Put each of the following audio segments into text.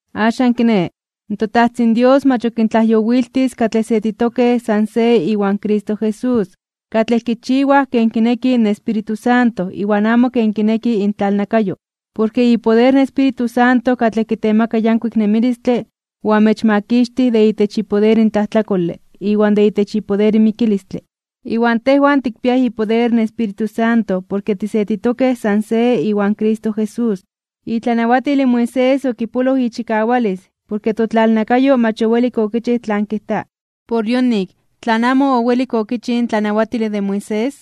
Axan kiné, in toTajtzin Dios mach ok kintlajyowiltis katlej setitokej san se iwan Cristo Jesús, katlej kichiwaj ken kineki in Espíritu Santo iwan amo ken kineki intlalnakayo. Porke ipoder in Espíritu Santo katlej kitemaka yankuik nemilistle oamechmakixtij de itech ipoder in tlajtlakole iwan de itech ipoder in mikilistle. Iwan tejwan tikpiaj ipoder in Espíritu Santo porke tisetitokej san se iwan Cristo Jesús. Itlanawatil in Moisés okipoloj ichikawalis porke totlalnakayo mach owelik okichij tlan kijta. Por yonik tlan amo owelik okichij in tlanawatile de Moisés,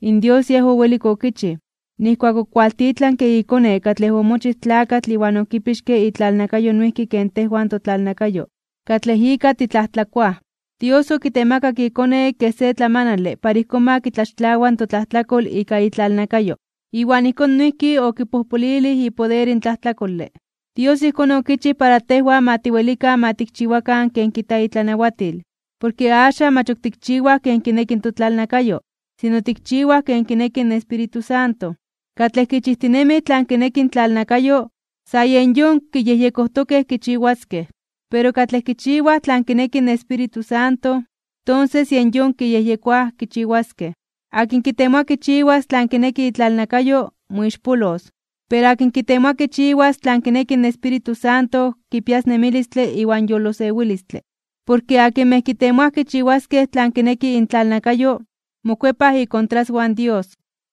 in Dios Yej owelik okichij, nijkuak okualtitlanke iKone katlej omochij tlakatl iwan okipixke itlalnakayo noijki ken tejwan totlalnakayo katlej ika titlajtlakoaj. Dios okitemakak iKone kej se tlamanale para ijkón ma kitlaxtlawa totlajtlakol ika itlalnakayo, iwan ijkón noijki okipojpolilij ipoder in tlajtlakole. Dios ijkón okichij para tejwan ma tiwelikan ma tikchiwakan tlan kijta itlanawatil. Porke axan mach ok tikchiwaj ken kineki in totlalnakayo, sino tikchiwaj ken kineki in Espíritu Santo. Katlej kichijtinemij tlan kineki intlalnakayo, san yen yon kiyejyekojtokej kichiwaskej. Pero katlej kichiwaj tlan kineki in Espíritu Santo, tonses yen yon kiyejyekoaj kichiwaskej. Akin kitemoa kichiwas tlan kineki itlalnakayo, moixpolos. Pero akin kitemoa kichiwas tlan kineki in Espíritu Santo, kipias nemilistle iwan yolosewilistle. Porke akinmej kitemoaj kichiwaskej tlan kineki intlalnakayo, mokuepaj ikontraswan Dios.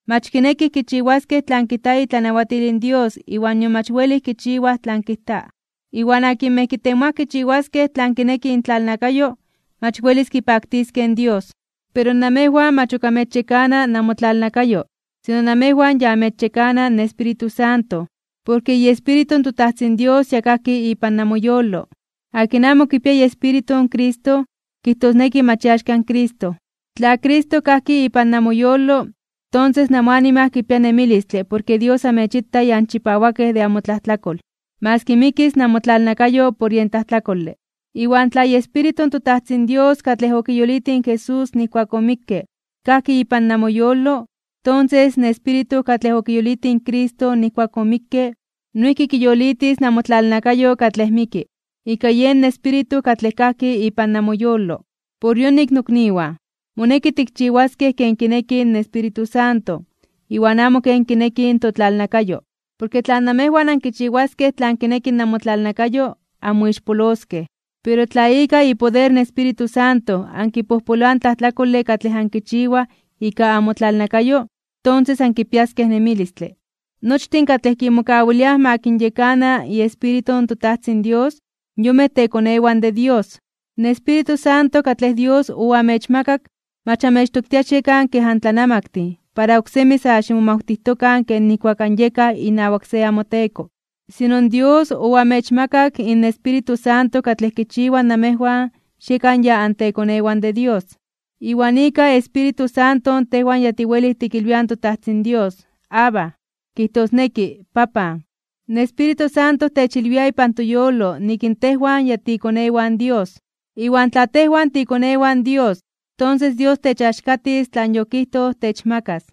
Mach kinekij kichiwaskej tlan kijta itlanawatil in Dios iwan nion mach welij kichiwaj tlan kijta. Iwan akinmej kitemoaj kichiwaskej tlan kineki intlalnakayo, mach welis kipaktiskej in Dios. Pero namejwan mach ok amechyekana namotlalnakayo, sino namejwan ya amechyekana in Espíritu Santo, porke iEspíritu in toTajtzin Dios ya kajki ipan namoyolo. Akin amo kipia iEspíritu in Cristo, kijtosneki mach iaxka in Cristo. Tla Cristo kajki ipan namoyolo, tonses namoanima kipia nemilistle porke Dios amechita ya anchipawakej de amotlajtlakol, maski mikis namotlalnakayo por yen tlajtlakole. Iwan tla iEspíritu in toTajtzin Dios katlej okiyolitij in Jesús nijkuak omikke, kajki ipan namoyolo, tonses in Espíritu katlej okiyolitij in Cristo nijkuak omikke, noijki kiyolitis namotlalnakayo katlej miki, ika yen Espíritu katlej kajki ipan namoyolo. Por yonik nokniwan, moneki tikchiwaskej ken kineki in Espíritu Santo, iwan amo ken kineki in totlalnakayo. Porke tla namejwan ankichiwaskej tlan kineki namotlalnakayo, anmoixpoloskej. Pero tla ika ipoder in Espíritu Santo ankipojpoloaj in tlajtlakole katlej ankichiwaj ika namotlalnakayo, tonses ankipiaskej nemilistle. Nochtin katlej kimokawiliaj ma kinyekana iEspíritu in toTajtzin Dios, yonmej tekonewan de Dios. In Espíritu Santo katlej Dios oamechmakak mach amechtoktia xiekan kej antlanamaktin para oksemi sa ximomawtijtokan ken nijkuak anyekaj inawak se amoteko. Sino Dios oamechmakak in Espíritu Santo katlej kichiwa namejwan xiekan ya antekonewan de Dios. Iwan ika Espíritu Santo tejwan ya tiwelij tikilwiaj in toTajtzin Dios: “¡Abba!”, kijtosneki “¡Papan!” In Espíritu Santo techilwia ipan toyolo nik tejwan ya tiikonewan Dios. Iwan tla tejwan tiikonewan Dios, tonses Dios techaxkatis tlan yokijtoj techmakas.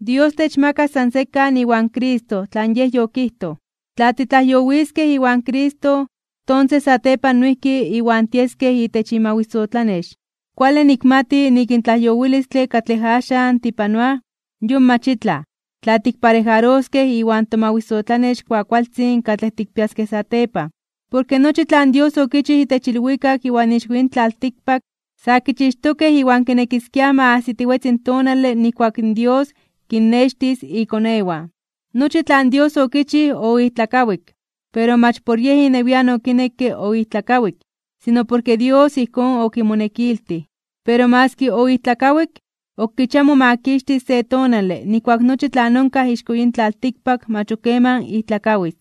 Dios techmakas san sekan iwan Cristo tlan Yej yokijtoj. Tla titlajyowiskej iwan Cristo, tonses satepan noijki Iwan tieskej itech imawisotlanex. Kuale nikmati nik in tlajyowilistle katlej axan tipanoaj, yon mach itlaj, tla tikparejaroskej iwan tomawisotlanex kuakualtzin katlej tikpiaskej satepan. Porke nochi tlan Dios okichij itech ilwikak iwan ixko yin tlaltikpak, sa kichixtokej iwan kinekiskiaj ma ajsitiwetzi in tonale nijkuak in Dios kinnextis ikonewan. Nochi tlan Dios okichij oijtlakawik, pero mach por yej inewian okinekke oijtlakawik, sino porke Dios ijkón okimonekiltij. Pero maski oijtlakawik, ok kichia momakixtis se tonale nijkuak nochi tlan onkaj ixko yin tlaltikpak mach ok keman ijtlakawis.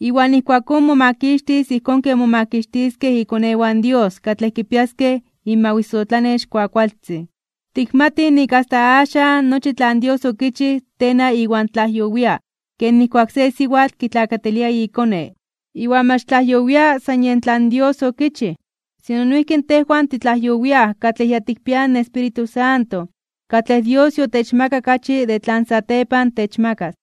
Iwan ijkuakón momakixtis ijkón ken momakixtiskej ikonewan Dios katlej kipiaskej inmawisotlanex kuakualtzin. Tikmatij nik asta axan nochi tlan Dios okichij tena iwan tlajyowia ken nijkuak se siwatl kitlakatilia ikone. Iwan mach tlajyowia san yen tlan Dios okichij, sino noijki tejwan titlajyowiaj katlej ya tikpiaj in Espíritu Santo katlej Dios yotechmakak achi de tlan satepan techmakas.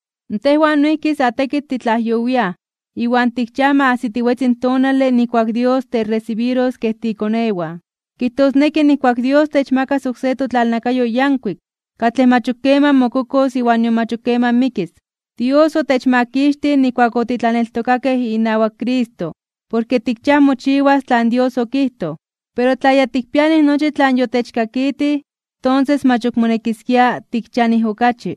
Tejwan noijki sa tekitl titlajyowiaj, iwan tikchiaj ma ajsitiwetzi in tonale nijkuak in Dios techresibiros kej tiikonewan. Kijtosneki nijkuak Dios techmakas oksé totlalnakayo yankuik, katlej mach ok keman mokokos iwan nion mach ok keman mikis. Dios otechmakixtij nijkuak otitlaneltokakej inawak Cristo porke tikchiaj mochiwas tlan Dios okijtoj. Pero tla ya tikpianij nochi tlan yotechkakitij, tonses mach ok monekiskia tikchianij okachi.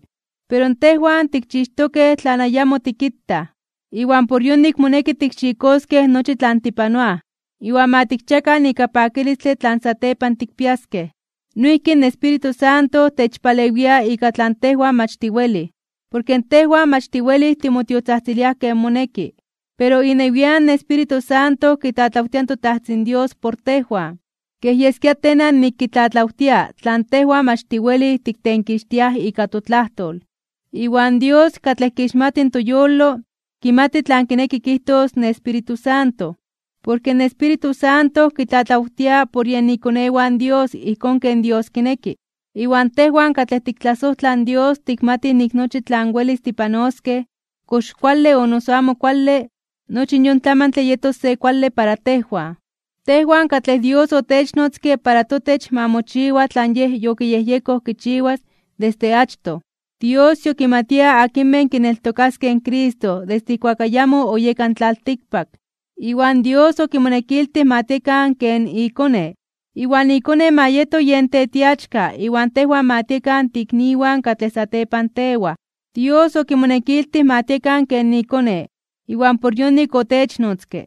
Pero tejwan tikchixtokej tlan ayamo tikitaj, iwan por yonik moneki tikxikoskej nochi tlan tipanoaj, iwan ma tikchiakan ika pakilistle tlan satepan tikpiaskej. Noijki in Espíritu Santo techpalewia ika tlan tejwan mach tiwelij, porke tejwan mach tiwelij timotiotzajtziliaj ken moneki. Pero inewian in Espíritu Santo kitlatlawtia in toTajtzin Dios por tejwan, kej yeskia tena nik kitlatlawtia tlan tejwan mach tiwelij tiktenkixtiaj ika totlajtol. Iwan Dios, katlej kixmati toyolo, kimati tlan kineki kijtos in Espíritu Santo, porke in Espíritu Santo kitlatlawtia por yen ikonewan Dios ijkón ken Dios kineki. Iwan tejwan katlej tiktlasojtlaj in Dios tikmatij nik nochi tlan welis tipanoskej, kox kuale o noso amo kuale, nochi yon tlamantle yetos se kuale para tejwan. Tejwan katlej Dios otechnotzke para totech ma mochiwa tlan Yej yokiyejyekoj kichiwas desde achtoj. Dios yokimatia akinmej kineltokaskej in Cristo desde ijkuak ayamo oyeka in tlaltikpak. Iwan Dios okimonekiltij ma tiekan ken iKone, iwan iKone ma yeto yen tetiachka iwan tejwan ma tiekan tiikniwan katlej satepan tewaj. Dios okimonekiltij ma tiekan ken iKone, iwan por yonik otechnotzke.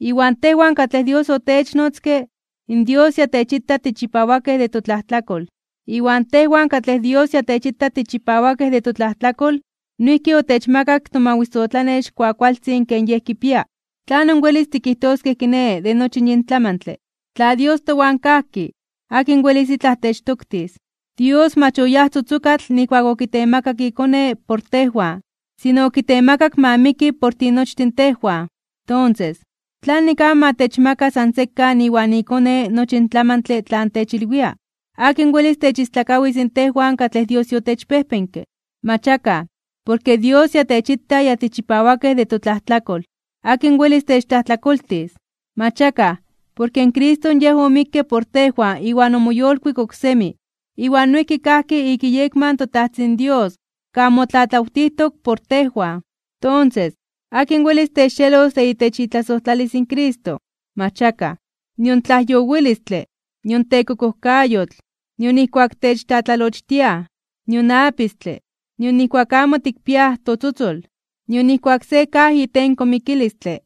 Iwan tejwan katlej Dios otechnnotzke, in Dios ya techita tichipawakej de totlajtlakol. Iwan tejwan katlej Dios ya techita tichipawakej de totlajtlakol, noijki otechmakak tomawisotlanex kuakualtzin ken Yej kipia. ¿Tlanon welis tikijtoskej kiné de nochi yin tlamantle? Tla Dios towan kajki, ¿akin welis itlaj techtoktis? Dios mach oyáj tzotzokatl nijkuak okitemakak iKone por tejwan, sino okitemakak ma miki por tinochtin tejwan. Tonses, ¿tlanik amo ma techmaka san sekan iwan iKone nochi in tlamantle tlan techilwia? ¿Akin welis techistlakawis tejwan katlej Dios yotechpejpenke? Mach akaj, porke Dios Yej techita ya tichipawakej de totlajtlakol. ¿Akin welis techtlajtlakoltis? Mach akaj, porke Cristo Yej omikke por tejwan iwan omoyolkuik oksemi, iwan noijki kajki ik iyekma in toTajtzin Dios kan motlatlawtijtok por tejwan. Tonses, ¿akin welis techxelos de itech itlasojtlalis in Cristo? Mach akaj. Nion tlajyowilistle, nion tekokojkayotl, nion nijkuak techtlatlalochtiaj, nion apistle, nion nijkuak amo tikpiaj totzotzol, nion nijkuak se kaj itenko mikilistle,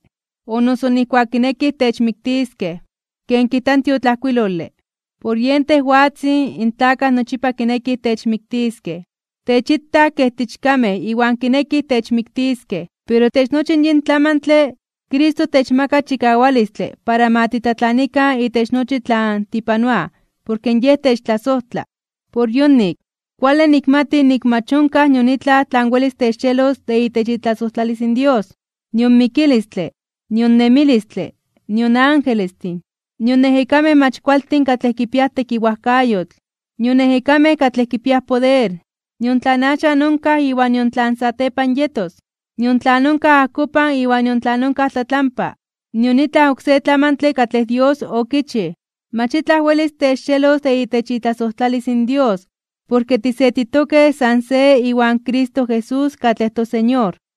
o noso nijkuak kinekij techmiktiskej. Ken kijta in tiotlajkuilole: Por yen tejwatzin, in tlakaj nochipa kinekij techmiktiskej. Techitaj kej tiichkamej iwan kinekij techmiktiskej. Pero itech nochi in yin tlamantle, Cristo techmaka chikawalistle para ma titlatlanikan itech nochi tlan tipanoaj porke Yej techtlasojtla. Por yonik, kuale nikmati nik mach onkaj nion itlaj tlan welis techxelos de itech itlasojtlalis in Dios. Nion mikilistle, nion nemilistle, nion angelestin, nion ejekamej mach kualtin katlej kipiaj tekiwajkayotl, nion ejekamej katlej kipiaj poder, nion tlan axan onkaj iwan nion tlan satepan yetos, nion tlan onkaj ajkopan iwan nion tlan onkaj tlatlampa, nion itlaj oksé tlamantle katlej Dios okichij. Mach itlaj welis techxelos de itech itlasojtlalis in Dios porke tisetitokej san se iwan Cristo Jesús katlej toSeñor.